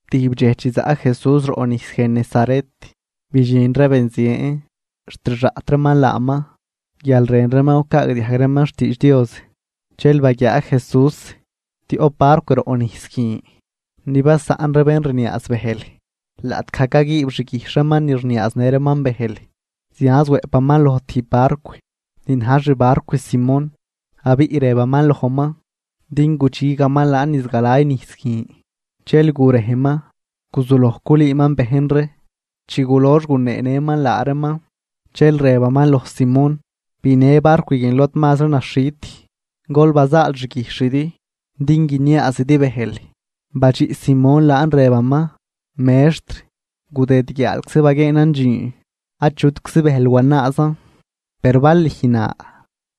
Tijb dxej chi zaꞌ Jesús roꞌ nijs Genesaret, bidxin ree benzien. Xt rxaꞌt reeman laaman guial rën reeman gucaagdiajg reeman xtiidx Dios. Dxel baguiaa Jesús tioꞌp barcw roꞌ nijs guin; ni basaꞌn ree bén rniaaz bëjl laꞌtgaj caguiib xguijxh reeman ni rniaaznë reeman bëjl. Zianz wëꞌpaman loj tijb barcw ni na̱j xbarcw Simón, abiꞌ rëbaman lojman din gudxigaman laan niz galay nijs guin. Dxel gurejman, guzuloj culüüman bejn ree. Chi gulox guneenëman laa reeman, dxel rëbaman loj Simón: ―Binë barcw guin lod mazri naxhit, gol bazaal xguijxhidi din guiniaazidi bëjl. Badxiꞌ Simón laan rëbaman: ―Mextr, gudëd guiaalczi baguieenan dxiin, achutczi bëjl wanaazan. Per bal lüj na,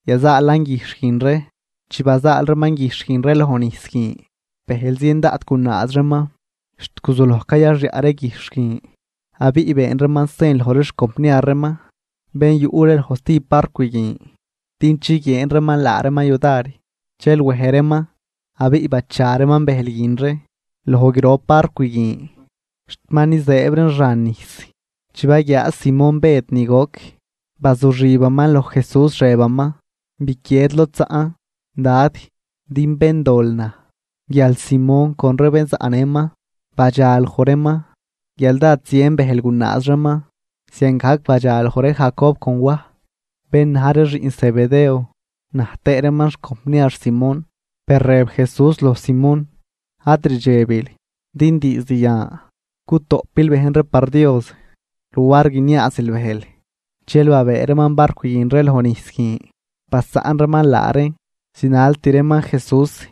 yazaalan guijxh guin ree. Chi bazaal reeman guijxh guin ree loj nijs guin, bëjl zien daꞌt gunaaz reeman xt guzuloj cayaxyaꞌ ree guijxh guin. Abiꞌ been reeman sen loj ree xcompniar reeman bén yuꞌ ree loj stijb barcw guin, din chiguieen reeman laa reeman yudar. Dxel wej reeman, abiꞌ bacha reeman bëjl guin ree loj grop barcw guin xt ma nizëëb reen xan nijs. Chi baguiaa Simón Bëd ni goc, bazuxibaman loj Jesús rëbaman: ―Biquied lod zaꞌn, Dad, din béndol naj. Guial Simón con ree bén zaꞌnëman badxa loj reeman guial dád zien bëjl gunaaz reeman. Ziangajc badxaloj ree Jacob con Waj, bén na̱j ree xiꞌn Zebedeo, na̱j tëë reeman xcompniar Simón. Per rëb Jesús loj Simón: ―Ad rdxebil, din diizd yan gutoꞌpil bejn ree par Dios luar guiniaazil bëjl. Dxel babëë reeman barcw guin ree loj nijs guin, basaꞌn reeman laa reen, zinalt reeman Jesús.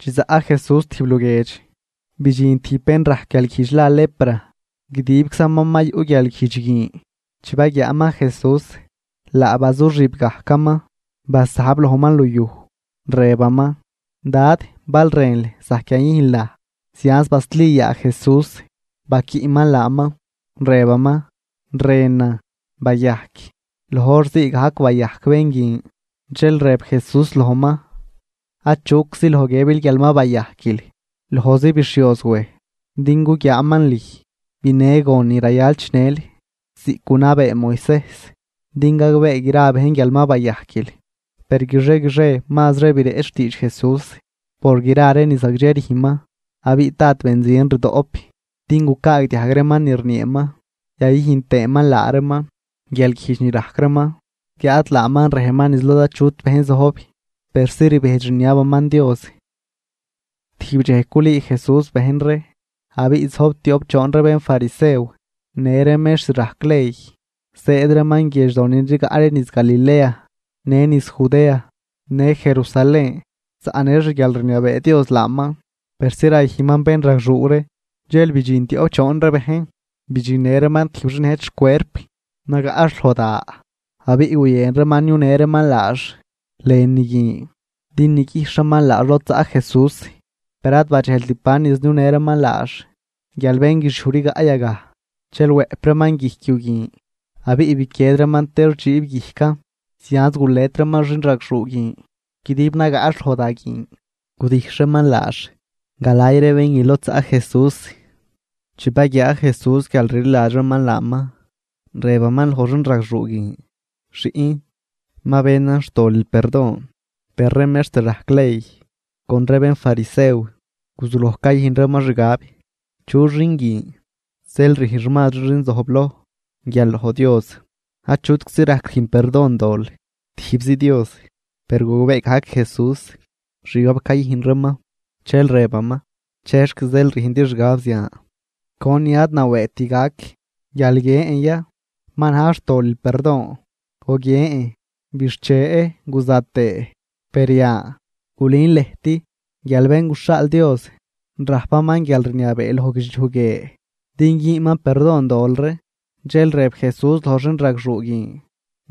Chi zaꞌ Jesús tijb luguiedx, bidxin tijb bén rajc guialguijdx la lepra, guidibczaman ma yuꞌ guialguijdx guin. Chi baguiaaman Jesús laa bazuxib gajcaman, basajb lojman luyuj, rëbaman: ―Dad, bal rënl, zajc yayüjnl naj. Zianz basli yaa Jesús baquiꞌman laaman, rëbaman: ―Rënan. Bayajc. Loj hor ziigajc bayajc bén guin. Dxel rëb Jesús lojman: ―Achuczi loj guiëbil guial ma bayajquil. Lojzi bixhioz wej din guguiaaman lüj. Binë gon ni rayal chinël ziꞌc gunabee Moisejs din gagbee gra bejn guial ma bayajquil. Per guixie guixie mazri bireꞌch xtiidx Jesús por gra ree ni zagdxe rüjnman. Abiꞌ dád benzien rdoꞌp din gucaagdiajg reeman ni rnieeman yayüjn tëëman laa reeman guialguijdx ni rajc reeman. Guiáad laaman rejman niz lod achut bejn zojb, persi rbejdx rniabaman Dios. Tijb dxej culüü Jesús bejn ree, abiꞌ zojb tioꞌp choon ree bénfarisew në ree mextr rajc ley, zëëd reeman guiedxdo ni rigaꞌ ree niz Galilea në niz Judea, në Jerusalén. Zaꞌnë xguialrniabee Dios laaman persi rayüjnman bénragxuu ree. Dxel bidxin tioꞌp choon ree bejn, bidxinnë reeman tijb xin nëjt xcuerp, nagaꞌx loj da. Abiꞌ guyën reeman niunë reeman laax lënü guin din niguijxh reeman laax lod zaꞌ Jesús. Per ad badxejlt ban niz niunë reeman laax guial bén guixiuj rigaꞌ yagaj. Dxel wëꞌp reeman guijc yu guin, abiꞌ biquied reeman tex dxiib guijcan, zianz gulet reeman xinragxuu guin guidib nagaꞌx loj da guin, gudijxh reeman laax galay ree bén guin lod zaꞌ Jesús. Chi baguiaa Jesús guial rliladx reeman laaman; rëbaman loj xinragxuu guin: ―Xiꞌn, ma benan xtolil perdon. Per ree mextr rajc ley con ree bénfarisew guzuloj cayüjn reeman xgab: “¿Chu xin guin zeel rüjnx mazri xin zojbloj guial loj Dios? Achutczi rajc rüjn perdon dol, tijbzi Dios.” Per gogbee gajc Jesús xgab cayüjn reeman, dxel rëbaman: ―¿Chexc zeel rüjndi xgab zian? ¿Conin ad nawëëgt gac, guial guiën ya: “Ma na̱j xtolil perdon”, o guiën: “Bixche guza tëë”? Per yan, gulün lëjt guial Bén guxhaal Dios rajpaman guialrniabee loj guidxliuj guie din güünman perdon dol ree. Dxel rëb Jesús loj xinragxuu guin: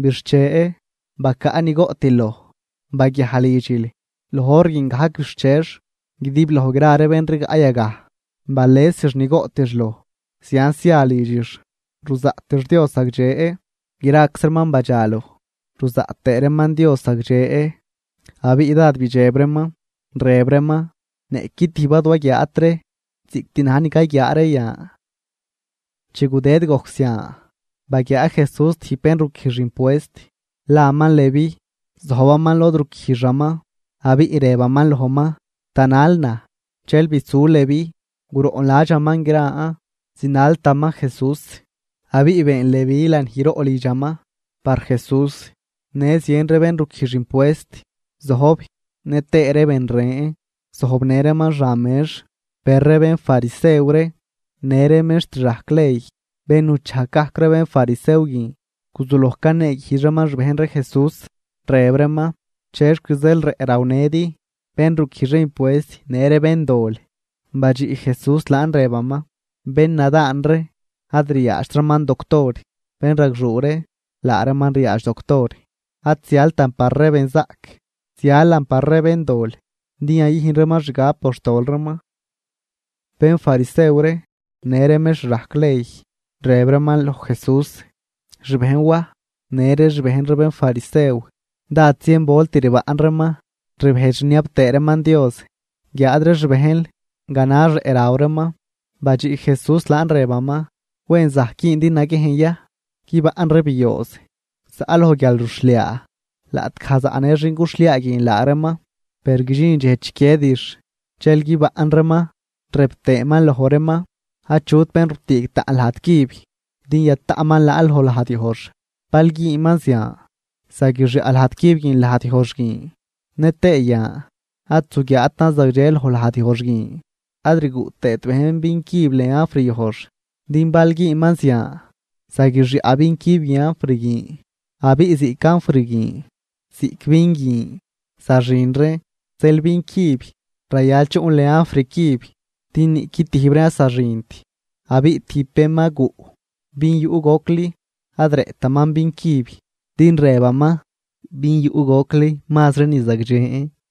―¡Bixche, bacaꞌ ni goꞌtil loj! Baguiaj lidxil. Loj hor guin gajc bixchex guidibloj gra ree bén rigaꞌ yagaj balesix ni goꞌtix loj, zianz zia lidxix ruzaꞌtix Dios zagdxe. Graczi reeman badxaloj ruzaꞌt tëë reeman Dios zagdxe abiꞌ dád bidxeb reeman, rëb reeman: ―¡Niꞌqui tijb ad waguiaat ree ziꞌct na̱j ni cayguiaa ree yan! Chi gudëd gojc zian, baguiaa Jesús tijb bén ruquijx impuest, laman Leví, zojbaman lod ruquijxaman. Abiꞌ rëbaman lojman: ―Tanal naj. Dxel bisu Leví, guroꞌnladxaman gran zinaltaman Jesús. Abiꞌ been Leví lanijroꞌ lidxaman par Jesús, në zien ree bén ruquijx impuest zojb nëtëë ree ben ren zojbnë reeman xan mex. Per ree bénfarisew ree në ree mextr rajc ley, bén nuchajg gajc ree bénfarisew guin, guzuloj caneeguijdx reeman xbejn ree Jesús, rëb reeman: ―¿Chexc zeel rëꞌ rawnëdi bén ruquijx ree impuest në ree béndol? Badxiꞌ Jesús laan rëbaman: ―Bénnadaan ree ad riaadxt reeman doctor, bénragxuu ree laa reeman riaadx Doctor. Ad zialtan par ree benzaꞌc, zialan par ree béndol din yayüjn reeman xgab por xtol reeman. Bénfarisew ree në ree mextr rajc ley, rëb reeman loj Jesús: ―Xbejn Waj, në ree xbejn ree bénfarisew dád zien volt rbaꞌn reeman rbejdx rniab tëë reeman Dios, guiáad ree xbejnl ganax rëꞌ raw reeman. Badxiꞌ Jesús laan rëbaman: ―¿Wen zajc güündi naguiejn ya guibaꞌn ree biooz zaꞌ loj guialruxhliaa, laꞌtgaj zaꞌnë xin cuxhliaa guin laa reeman? Per guidxin dxej chiquiedix, dxel guibaꞌn reeman. Rëb tëëman loj reeman: ―Achut bén rutüüg taꞌn lajd cüb din yataꞌman laan loj lajd yojx. Bal güünman zian, zaguixyaꞌ lajd cüb guin lajdyojx guin, nëtëë yan ad zuguiaatan zagdxe loj lajdyojx guin. Ad rguꞌ tëët bejn vin cüb lën anfr yojx, din bal güünman zian, zaguixyaꞌ vin cüb guin anfr guin, abiꞌ ziꞌc anfr guin ziꞌc vin guin zaxin reen. Zeel vin cüb rayal chuꞌn lën anfr cüb din niꞌqui tijb reen ad zaxint. Abiꞌ tijb bén ma guꞌ vin yuꞌ gocli ad rëꞌtaman vin cüb, din rëbaman: “Vin yuꞌ gocli mazri ni zagdxen.”